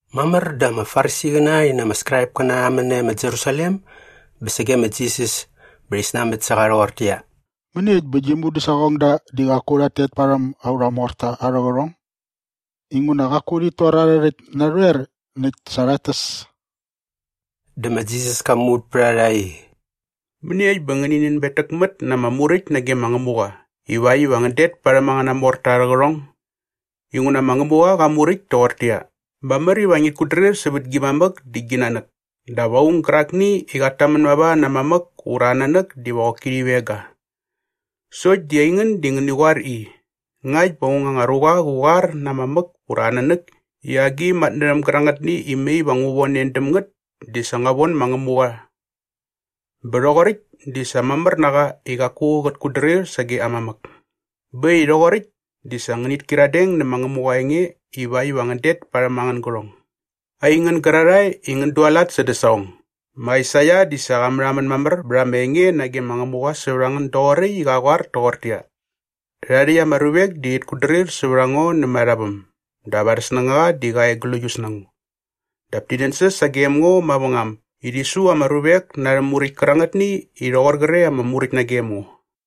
Mamär dä ama Farisiqäna rhi na ama Skraipkäna rha män nae ma Jerusalem bä sage ma Jisas bä rhi snanbät sä qa rhoqortäqyia, “Mäniekt bä gi mudäsaqongda di qaku rhat tet parhäm aurha morta arhä qärhong? Inguna qaku rhit tor arhä rhäkt narhoer näkt sa rhat täs.” Dä ma Jisas ka muvät pät a rha i, “Mäniekt bä ngänin nänbetäkmät na ama muräkt nage ma Ngämuqa ivakt iva ngän det parhäm angäna morta arhä qärhong? Inguna ma Ngämuqa qa muräkt toqortäqyia, ‘Mamär iva ngit kutdrir sävät gi mamäk dä gi nanäk’ dap ‘Aung gärakni i qat tamän mava na aa mamäk ura aa nanäk diva qoki rhi veng ga.’ Sokt di aingän di ngäni qoar i, ‘Ngakt bä aung anga ruqa qä qoar na aa mamäk ura na aa nanäk i agi matnärhäm gärangätni i mai va ngu von en däm ngät di sa ngua von ma Ngämuqa bä rhoqoräkt di sa mamär na qa i qaku qät kutdrir sage aa mamäk.’ Bä äkt i rhoqoräkt di sa ngänit kyiradeng nä ma Ngämuqa aa enge ivakt iva ngän det parhäm angän gärhong. Aingän gärarhae i ngän dualat sädä saqong, ma Aisaia di sa qa märhamän mamär bät ama enge nage ma Ngämuqa sävät a ngän doqoräkt i qa qoar toqortäqyia, “‘Rhärhae rhäkt ama ruvek di rhit kutdrir sävät a ngo nämät arha väm dap arhä snängaqa di qa e gläius na ngo. Dap ti nänsäs sagem ngo mavängam i rhi su ama ruvek na arhä muräkt kärangätni i rhoqor qre ama muräkt nagem ngo.’”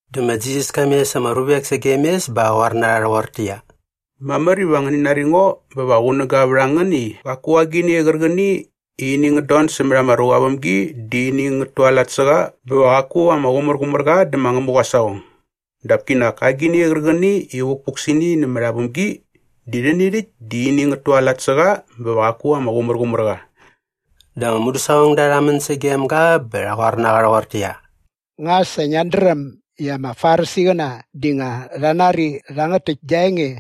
Dä ma Jisas ka mes ama ruvek sagem mes bä qa qoar na rha rhoqortäqyia, “Mamär iva ngäni nari ngo bä va qunäga vät a ngän i qaku agini qärqäni i ini ngät don sämät ama ruqa aa vämgi di ini ngät tualat sä qa bä va qaku ama qumärqumär qa dä ma Ngämuqa aa saqong. Dap kinak agini qärqäni i vukpuk sä ini nämät aa vämgi di rhäni rhäkt di ini ngät tualat sä qa bä va qaku ama qumärqumär qa.” Dä ama mudäsaqongda rha män sagem ga bä rha qoar na qa rhoqortäqyia, “Nga sa ngiat dräm i ama Farisiqäna di nga rha nari rhangät täkt gia enge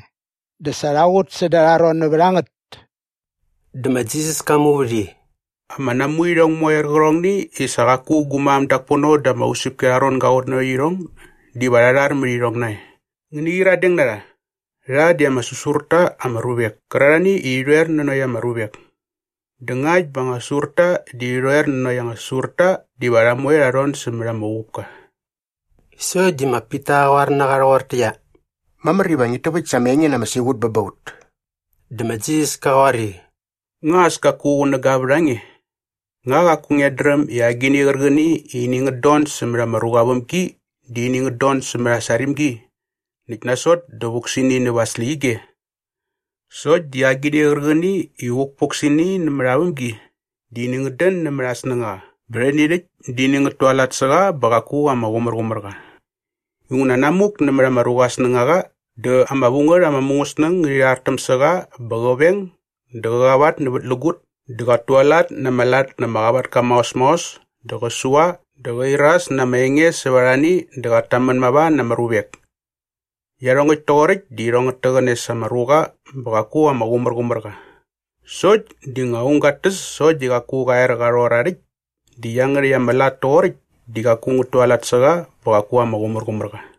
dä sa rha qut säda arha ron nävät a ngät?” Dä ma Jisas ka muvät i, “Ama namuirhong moe qärqärhongni i sa qaku gu mam dak pono da ama usäpki arha ron ga qutnanokt irhong diva rha rhar mät irhong nae. Ngäni qyiradeng na rha. Rha di ama säsur ta ama ruvek kärarhani i rhi rhoer nanokt ama ruvek. Dä ngakt bä anga säsurta di rhi rhoer nanokt anga säsurta diva rha moe rha rhon sämät ama uqupka.” Sokt di ma Pita qa qoar na qa rhoqortäqyia, “Mamär iva ngit täväkt sa ama enge na ama siqutki bä ba ut.” Dä ma Jisas ka qoar i, “Nga as kaku qunäga vät a nge? Nga qaku ngiat dräm i agini qärqäni i ini ngät don sämät ama ruqa aa vämgi di ini ngät don sämät aa sarimgi näkt nasot dä vuk sä ini näva aa släqyige? Sokt di agini qärqäni i vukpuk sä ini nämät aa vämgi di ini ngät dän nämät aa snängaqa bä rhäni rhäkt di ini ngät tualat sä qa bä qaku ama qumärqumär qa. Inguna namuk nämät ama ruqa aa snängaqa dä ama vu ngät ama mungäsnäng ngärhi rhartäm sä qa bä qä veng dä qä qavatnävätlägut dä qat tualat na ama lat na ama qavatka maos maos dä qä sua dä qä iras na ama enge sävät arhani dä qat tamän mava na ama ruvek. Iarhongäkt toqoräkt di irhong ngät täqäne sa ama ruqa bä qaku ama qumärqumär qa. Sokt di nga aung gat täs sokt di qaku qa er qa rhor aa rhäkt di iangärhäkt ama lat toqoräkt di qaku ngät tualat sä qa bä qaku ama qumärqumär qa.”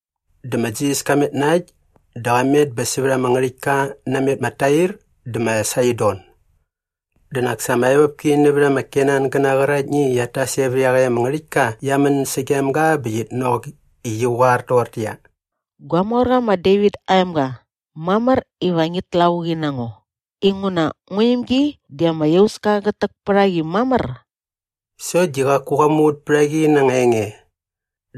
Dä ma Jisas ka met na äkt dä qa met bä sävät ama ngärhäktka namet ma Tair dä ma Saidon. Dä nak sa ama evopki nävät ama Kenangäna qäraktni i qiat tas e vä iaqäkt ama ngärhäktka qia män sagem ga bä qit nok i qi qoar toqortäqyia, “Gua morqa ma Devit aa emga, mamär iva ngit lavuqi na ngo inguna ngua imgi di ama iauska qät täk pät a qi mamär.” Sokt di qaku qa muvät pät a qi na anga enge.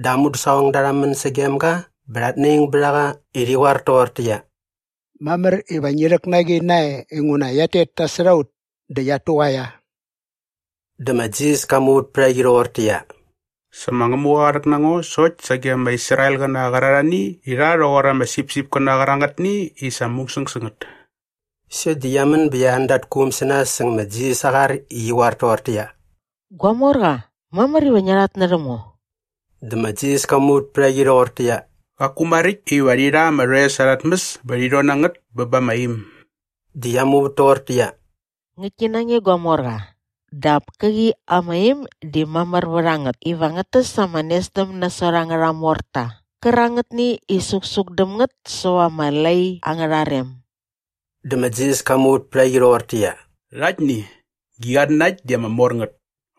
Dä aa mudäsaqongda rha män sagem ga bä rhat naing bät a qa i rhi qoar toqortäqyia, “Mamär iva ngi rhäk na qi nae inguna qiat tet nasot a ut dä qiat tuqaia.” Dä ma Jisas ka muvät pät a qi rhoqortäqyia, “Sa ma Ngämuqa qa rhäk na ngo sokt sage ama Israelqäna qärarhani i rha rhoqor ama sipsipkäna qärangätni i sa musäng sä ngät.” Sokt di qia män bä qia an da arha quum sä nas säng ma Jisas aa qar i qi qoar toqortäqyia, “Gua morqa, mamär iva ngia rhatnärhäm ngo.” Dä ma Jisas ka muvät pät a qi rhoqortäqyia, “Qaku maräkt iva rhi rha ama rhoes arha tmäs bä rhi rhon na ngät bä ba ama im.” Dä qia muvät toqortäqyia, “Ngäktki na nge gua morqa, dap käqi ama im di mamär vät a ngät iva ngät täs ama nesdäm nasot angärha morta qärangätni i suksuk däm ngät säva ama lai angärha rem.” Dä ma Jisas ka muvät pät a qi rhoqortäqyia, “Rhaktni, gi qatnanakt di ama mor ngät!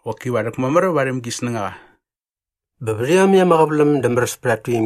Qoki va rhäkmamär varhäm gi snängaqa.” Bä vät iomäkt ama qäväläm dä märäs pät at tuimgi.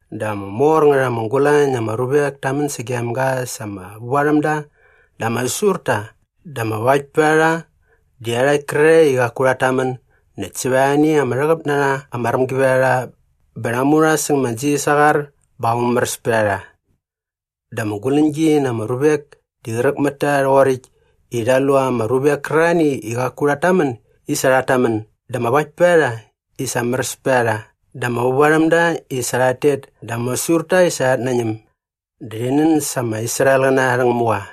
Dä ama mor ngät ama gulañ na ama ruvek ta män sagem ga sa ama vävarhämda dä ama säsurta dä ama vaktpärharha dä iarhakt kärarhae i qaku rhat tamän näkt sävät arhani ama rhäqäp na rha ama rämgivärharha bä rha mu rha säng ma Jisas aa qar bä qa mumäräs pät a rha. Dä ama guläñgi na ama ruvek di qräk mät ta rhoqoräkt i rha lu ama ruvek kärarhani i qaku rhat tamän i sa rhat tamän dä ama vaktpärharha i sa märäs pät a rha dä ama vävarhämda i sa rhat tet dä ama säsurta i sa rhat nañäm. Dä rhi nän sa ama Israelqäna arhä Ngämuqa.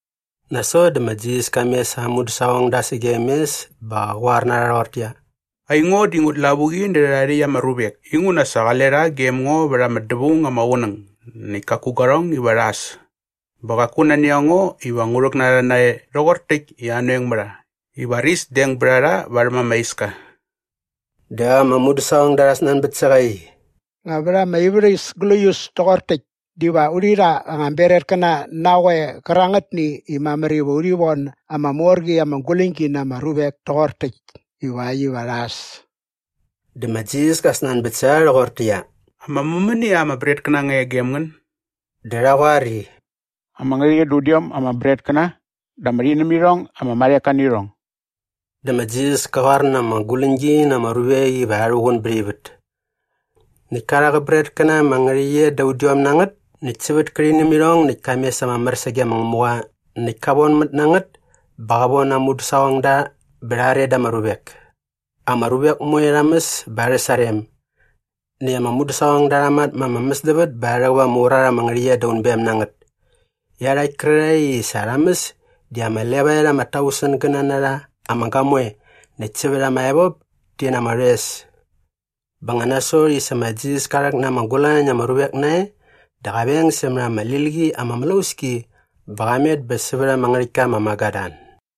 Nasot dä ma Jisas ka mes aa mudäsaqongda sagem mes bä qa qoar na rha rhoqortäqyia, “Aingo di ngut lavuqi nä rhärhae rhäkt ama ruvek inguna sa qale rha gem ngo vät ama dävaung ama qunäng näkt kaku guarhong iva rha äs. Bä qaku nani a ngo iva ngu rhäk na rha nae rhoqor täkt i anoeng mä rha i varis deng bät a rha varhäm ama iska.” Dä ama mudäsaqongda rha snanbät sä qa i, “Nga vät ama ivärhäs gläius toqor täkt diva urhi rha anga bretkäna na qoe qärangätni i mamär iva urhi von ama mor qi ama guläñgi na ama ruvek toqor täkt ivakt iva rha äs?” Dä ma Jisas ka snanbät sä rha rhoqortäqyia, “Ama mämänia ama bretkäna nga e gem ngän?” Dä rha qoar i, “Ama ngärhäqyet da udiom ama bretkäna dä ama rhinämirhong ama marheka nä irhong.” Dä ma Jisas ka qoar na ama guläñgi na ama ruvek iva rha rhuqun bät ivät. Näkt ka rha qä bretkäna ama ngärhäqyet da udiom na ngät näkt sävät kä rhinämirhong näkt ka mes ama mär sage ma Ngämuqa näkt ka vonmät na ngät bä qa von aa mudäsaqongda bä rha are da ama ruvek. Ama ruvek moe rha mäs bä arhä sarem. Näkt ama mudäsaqongda rha matma ama mäsdävät bä rha rhäqäp ama urat ama ngärhäqyet da unbem na ngät. Iarhakt kärarhae i sa rha mäs di ama levaet ama tausengäna na rha ama gamoe näkt sävät ama evop ti na ama rhoes. Bä nga nasot i sa ma Jisas ka rhäk na ama gulañ na ama ruvek nae dä qa veng sämät ama lil qi ama mlauski bä qa met bä sävät ama ngärhäktka ma Magadan.